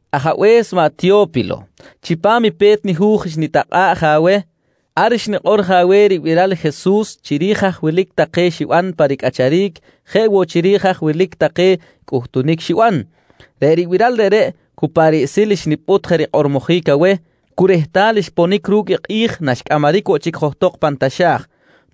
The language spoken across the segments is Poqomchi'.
Ajabe̱s maꞌ Teyo̱pilo: Chipam i pe̱t nihu̱j xnitakꞌa̱ꞌ je aweh, ar xnikꞌor je aweh ribiral i Jesus chiri̱j haj wilic take xiban pa ricꞌacharic jeꞌ woꞌ chiri̱j haj wilic take cꞌuhtunic xiban. Reꞌ ribiral reꞌreꞌ cu pa riꞌsil xnipꞌut je rikꞌormojic aweh cu rehtal xponic ru̱cꞌ i kꞌi̱j naxcꞌamaric woꞌ chic johtok pan taxa̱j.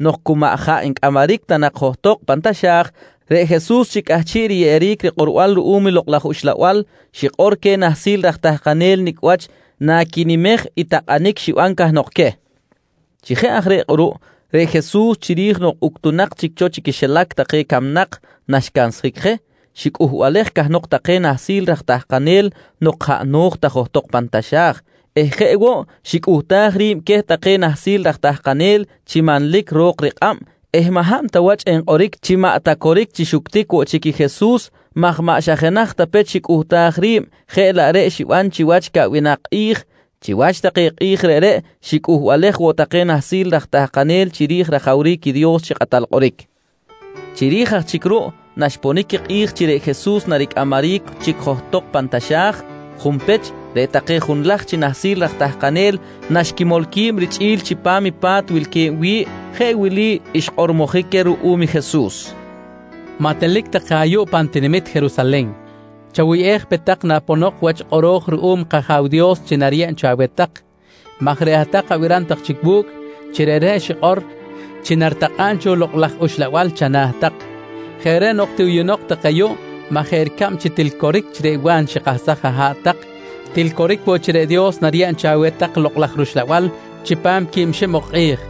Nok cu maꞌ jaꞌ ncꞌamaric ta johtok pan taxa̱j, reꞌ Jesus chi cꞌahchiꞌ riyeꞌeric rikꞌorbal ruꞌum Lokꞌ laj Uxlabal xikꞌor queh nahsil raj tahkanel nicꞌ wach naquinimej i takꞌanic xiban cahnok queh. Chi jeꞌ aj reꞌ kꞌuruꞌ, reꞌ Jesus chiri̱j nok uctunak chic cho chi quixilac take camnak naxcansjic je, xicꞌuhbalej cahnok take nahsil raj tahkanel nok jaꞌ no̱j ta johtok pan taxa̱j eh jeꞌ woꞌ xicꞌuhtaj ri̱b queh take nahsil raj tahkanel chi manlic ro̱k rikꞌab eh maꞌ hab ta wach enkꞌoric chi maꞌ ta coric chi xuctic woꞌ chic i Jesus maj maꞌ xa jenaj ta pech xicꞌuhtaj ri̱b jeꞌ laꞌ reꞌ xiban chiwach caꞌwinak kꞌi̱j. Chiwach take kꞌi̱j reꞌreꞌ xicꞌuhbalej woꞌ take nahsil raj tahkanel chiri̱j rajawric i Dios chi kꞌatal kꞌoric. Chiri̱j aj chic ruꞌ naxponic i kꞌi̱j chi reꞌ Jesus naricꞌamaric chic johtok pan taxa̱j, junpech reꞌ take junlaj chi nahsil raj tahkanel naxquimol qui̱b richꞌi̱l chipam pa̱t wilque̱b wi̱ꞌ, jeꞌ wili xkꞌormojic queh ruꞌum i Jesus: «Maꞌ telic tak je ayuꞌ pan tinamit Jerusalen. Chawuyꞌej pe tak naponok wach i kꞌoro̱j ruꞌum kAja̱w Dios chi nariyeb cho aweh tak maj reꞌ hat-tak abiram tak chic wu̱cꞌ chi reꞌreꞌ xikꞌor chi naritakꞌa̱b cho i Lokꞌ laj Uxlabal chana̱ tak. Jeꞌ reꞌ nok tiꞌuyunok tak ayuꞌ maj jeꞌ ricab chi til coric chi reꞌ Wa̱n xikahsaj aha̱ꞌ tak, til coric woꞌ chi reꞌ Dios nariyeb cho aweh tak i Lokꞌ laj rUxlabal chipam quib xib ok kꞌi̱j, nqui queh.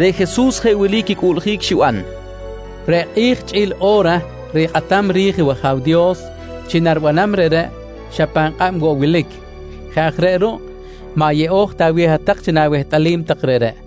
Reꞌ Jesus jeꞌ wili quicꞌuꞌljic xiban: «Reꞌ kꞌi̱j, chꞌi̱l i o̱ra rikꞌatam ri̱j i wAja̱w Dios chi naribanam reꞌreꞌ, xa pan kꞌab woꞌ wilic. Jeꞌ aj reꞌ ruꞌ maꞌ yeꞌo̱j ta aweh hat-tak chi na̱wehtꞌalim tak reꞌreꞌ.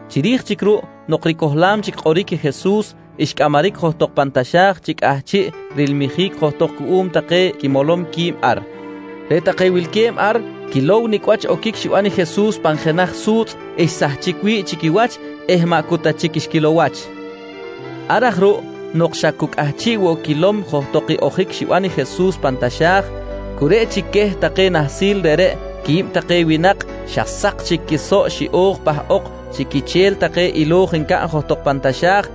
Chiri̱j chic ruꞌ nok ricohlam chic kꞌoric i Jesus, xcꞌamaric johtok pan taxa̱j chi cꞌahchiꞌ rilmijic johtok cuꞌum take quimolom qui̱b ar. Reꞌ take wilque̱b ar quilow nicꞌ wach oquic xiban i Jesus pan jenaj su̱tzꞌ xsahchic wi̱ꞌ chi quiwach eh maꞌ cu ta chic xquilow wach. Ar aj ruꞌ nok xa cu cꞌahchiꞌ woꞌ quilom johtok i ojic xiban i Jesus pan taxa̱j, cu reꞌ chic queh take nahsil reꞌreꞌ quib take winak xa sak chic quisoꞌ xiꞌo̱j pahꞌok chi quiche̱l take ilo̱j ncaꞌn johtok pan taxa̱j.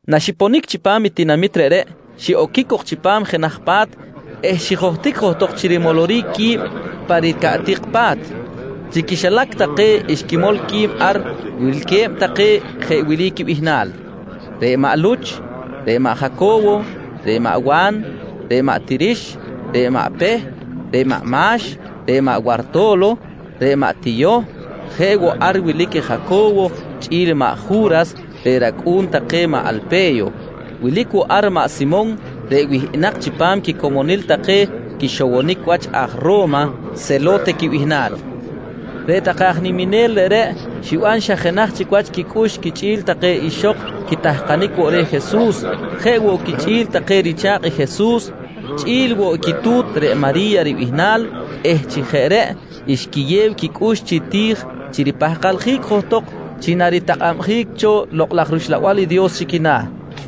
Naxiponic chipam i tinamit reꞌreꞌ, xiꞌoquic cok chipam jenaj pa̱t eh xijohtic johtok chi rimoloric qui̱b pa ricaꞌtik pa̱t. Chi quixilac take xquimol qui̱b ar wilque̱b take jeꞌ wili quibihnal: Reꞌ maꞌ Luch, reꞌ maꞌ Jaco̱wo, reꞌ maꞌ Wa̱n, reꞌ maꞌ Tirix, reꞌ maꞌ Peh, reꞌ maꞌ Ma̱x, reꞌ maꞌ Warto̱lo, reꞌ maꞌ Tiyoh. Jeꞌ woꞌ ar wilic i Jaco̱wo chꞌi̱l maꞌ Ju̱ras reꞌ racꞌu̱n take maꞌ Alpe̱yo. Wilic woꞌ ar maꞌ Simon reꞌ wihꞌinak chipam quicomonil take quixowonic wach aj Ro̱ma Selo̱te quibihnal. Reꞌ take aj niminel reꞌreꞌ xiban xa jenaj chic wach quicꞌux quichꞌi̱l take ixok quitahkanic woꞌ reh Jesus, jeꞌ woꞌ quichꞌi̱l take richa̱kꞌ i Jesus, chꞌi̱l woꞌ i quitu̱t reꞌ Mari̱ya ribihnal eh chi jeꞌ reꞌ xquiyew quicꞌux chi ti̱j chi ripahkaljic johtok chi naritakꞌabjic cho Lokꞌ laj rUxlabal i Dios chi quina̱.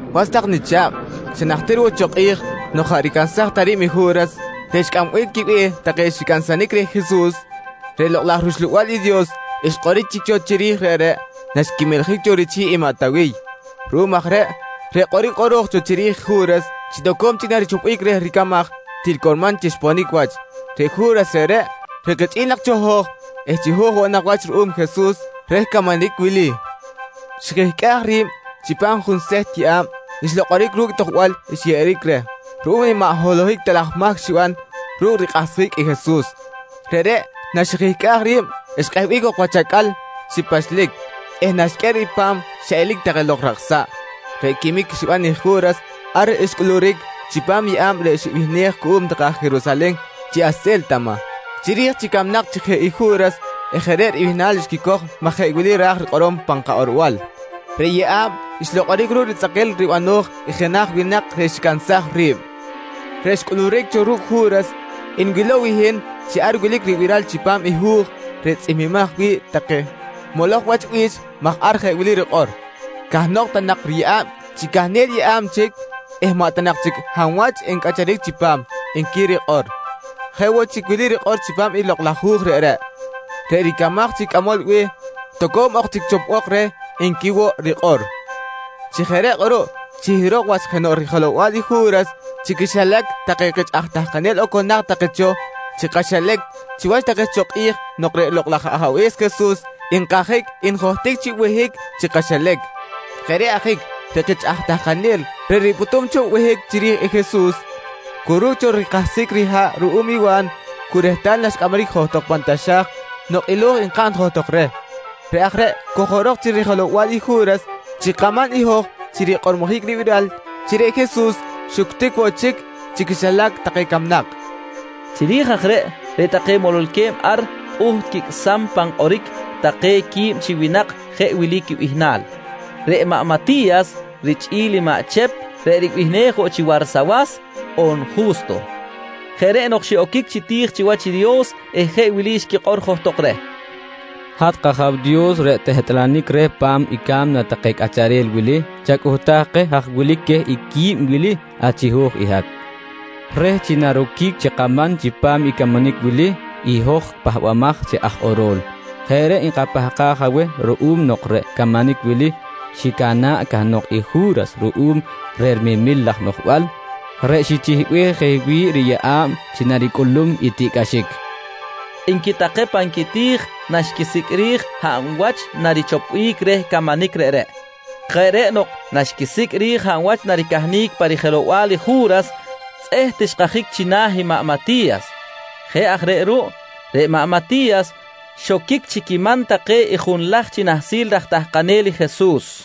«Was tak nicha̱kꞌ, xa najtir woꞌ cho kꞌi̱j nok jaꞌ ricansaj ta ri̱b i Ju̱ras reꞌ xcꞌambic quibe̱h take xicansanic reh i Jesus, reꞌ Lokꞌ laj rUxlabal i Dios xkꞌoric chic cho chiri̱j reꞌreꞌ naxquimeljic cho richi̱ꞌ i maꞌ Tawiy. Ruꞌum aj reꞌ, reꞌ kꞌoric kꞌoro̱j cho chiri̱j i Ju̱ras chi toco̱m chic narichopbic reh ricamaj, til curman chi xponic wach. Reꞌ Ju̱ras reꞌreꞌ, reꞌ kichꞌi̱l nak cho hoj eh chiho̱j woꞌ nak wach ruꞌum Jesus reh camanic wili, xijihcꞌaj ri̱b chipam junseht yeꞌa̱b xlokꞌoric ru̱cꞌ i tojbal xyeꞌeric reh ruꞌum i maꞌ holohic ta laj mahc xiban ru̱cꞌ rikꞌahsjic i Jesus. Reꞌreꞌ naxijihcꞌaj ri̱b, xkꞌehbic woꞌ jok wach acꞌal chi pachlic eh naxqꞌuer i pa̱m xiꞌelic take lok rakꞌsa̱ꞌ. Reꞌ quimic xiban i Ju̱ras ar xcꞌuluric chipam i yeꞌa̱b reꞌ xibihnej cuꞌum take aj Jerusalen chi “Hase̱ltama” chiri̱j chi camnak chic je i Ju̱ras eh jeꞌ reꞌ ribihnal xquicoj maj jeꞌ wili ra̱j rikꞌorom pan kakꞌorbal: “Reꞌ Yeꞌa̱b xlokꞌoric ru̱cꞌ ritzꞌakil ribano̱j i jenaj winak reꞌ xicansaj ri̱b”. «Reꞌ xcꞌuluric cho ru̱cꞌ Ju̱ras, nwilow i hin chi ar wilic ribiral chipam i hu̱j reꞌ tzꞌihmbimaj wi̱ꞌ take moloj wach bi̱ch maj ar jeꞌ wili rikꞌor: “Cahnok ta nak riyeꞌa̱b chi cahnel yeꞌa̱b chic eh maꞌ ta nak chic hab wach ncꞌacharic chipam, nqui rikꞌor. Jeꞌ woꞌ chic wili rikꞌor chipam i Lokꞌ laj Hu̱j reꞌreꞌ: “Reꞌ ricamaj chi cꞌamol be̱h, toco̱m ok chic chopbok reh, nqui woꞌ rikꞌor. «Chi jeꞌ reꞌ kꞌuruꞌ, chihirok wach jenoꞌ rijelow-bal i Ju̱ras chi quixilac take kich aj tahkanel oconak take cho chi kaxilac chiwach take cho kꞌi̱j nok reꞌ Lokꞌ laj Ajabe̱s Jesus nkajic njohtic chi behic chi kaxilac. Jeꞌ reꞌ ajic reꞌ kich aj tahkanel reꞌ ripꞌutum cho behic chiri̱j i Jesus cu ru̱cꞌ cho rikahsjic riha̱ꞌ ruꞌum i Wa̱n cu rehtal naxcꞌamaric johtok pan taxa̱j nok ilo̱j nkaꞌn johtok reh, reꞌ aj reꞌ cojorok chi rijelow-bal i Ju̱ras chi kaman i hoj chi rikꞌormojic ribiral chi reꞌ Jesus xuctic woꞌ chic chi quixilac take camnak, nqui maꞌ Luch. Chiri̱j aj reꞌ, reꞌ take mololque̱b ar pꞌuht quicꞌsam pan kꞌoric take qui̱b chi winak jeꞌ wili quibihnal: Reꞌ maꞌ Mati̱yas richꞌi̱l i maꞌ Chep reꞌ ribihnej woꞌ chi Warsawas on Ju̱sto. Jeꞌ reꞌ nok xiꞌoquic chi ti̱j chiwach i Dios eh jeꞌ wili xquikꞌor johtok reh: «Hat kAja̱w Dios reꞌ tehtꞌalanic reh pa̱m i ca̱mna take cꞌacharel wili, chacꞌuhtaj keh haj wilic queh i qui̱b wili achiho̱j i hat, reh chi naroquic chi kaman chipam i camanic wili i hoj pahbamaj chi aj kꞌoro̱l. Jeꞌ reꞌ nkapahkaj aweh ruꞌum nok reꞌ camanic wili xicana̱ꞌ cahnok i Ju̱ras ruꞌum reh rimemil laj noꞌjbal reꞌ xichihbej je wi̱ꞌ riyeꞌa̱b chi naricꞌulum i tiꞌcꞌaxic, nqui take pan quiti̱j naxquisicꞌ ri̱j hab wach narichopbic reh camanic reꞌreꞌ. Jeꞌ reꞌ nok naxquisicꞌ ri̱j hab wach naricahnic pa rijelow-bal i Ju̱ras, tzꞌeht xkajic china̱ i maꞌ Mati̱yas. Jeꞌ aj reꞌ ruꞌ, reꞌ maꞌ Mati̱yas xoquic chi quiman take i junlaj chi nahsil take raj tahkanel i Jesus.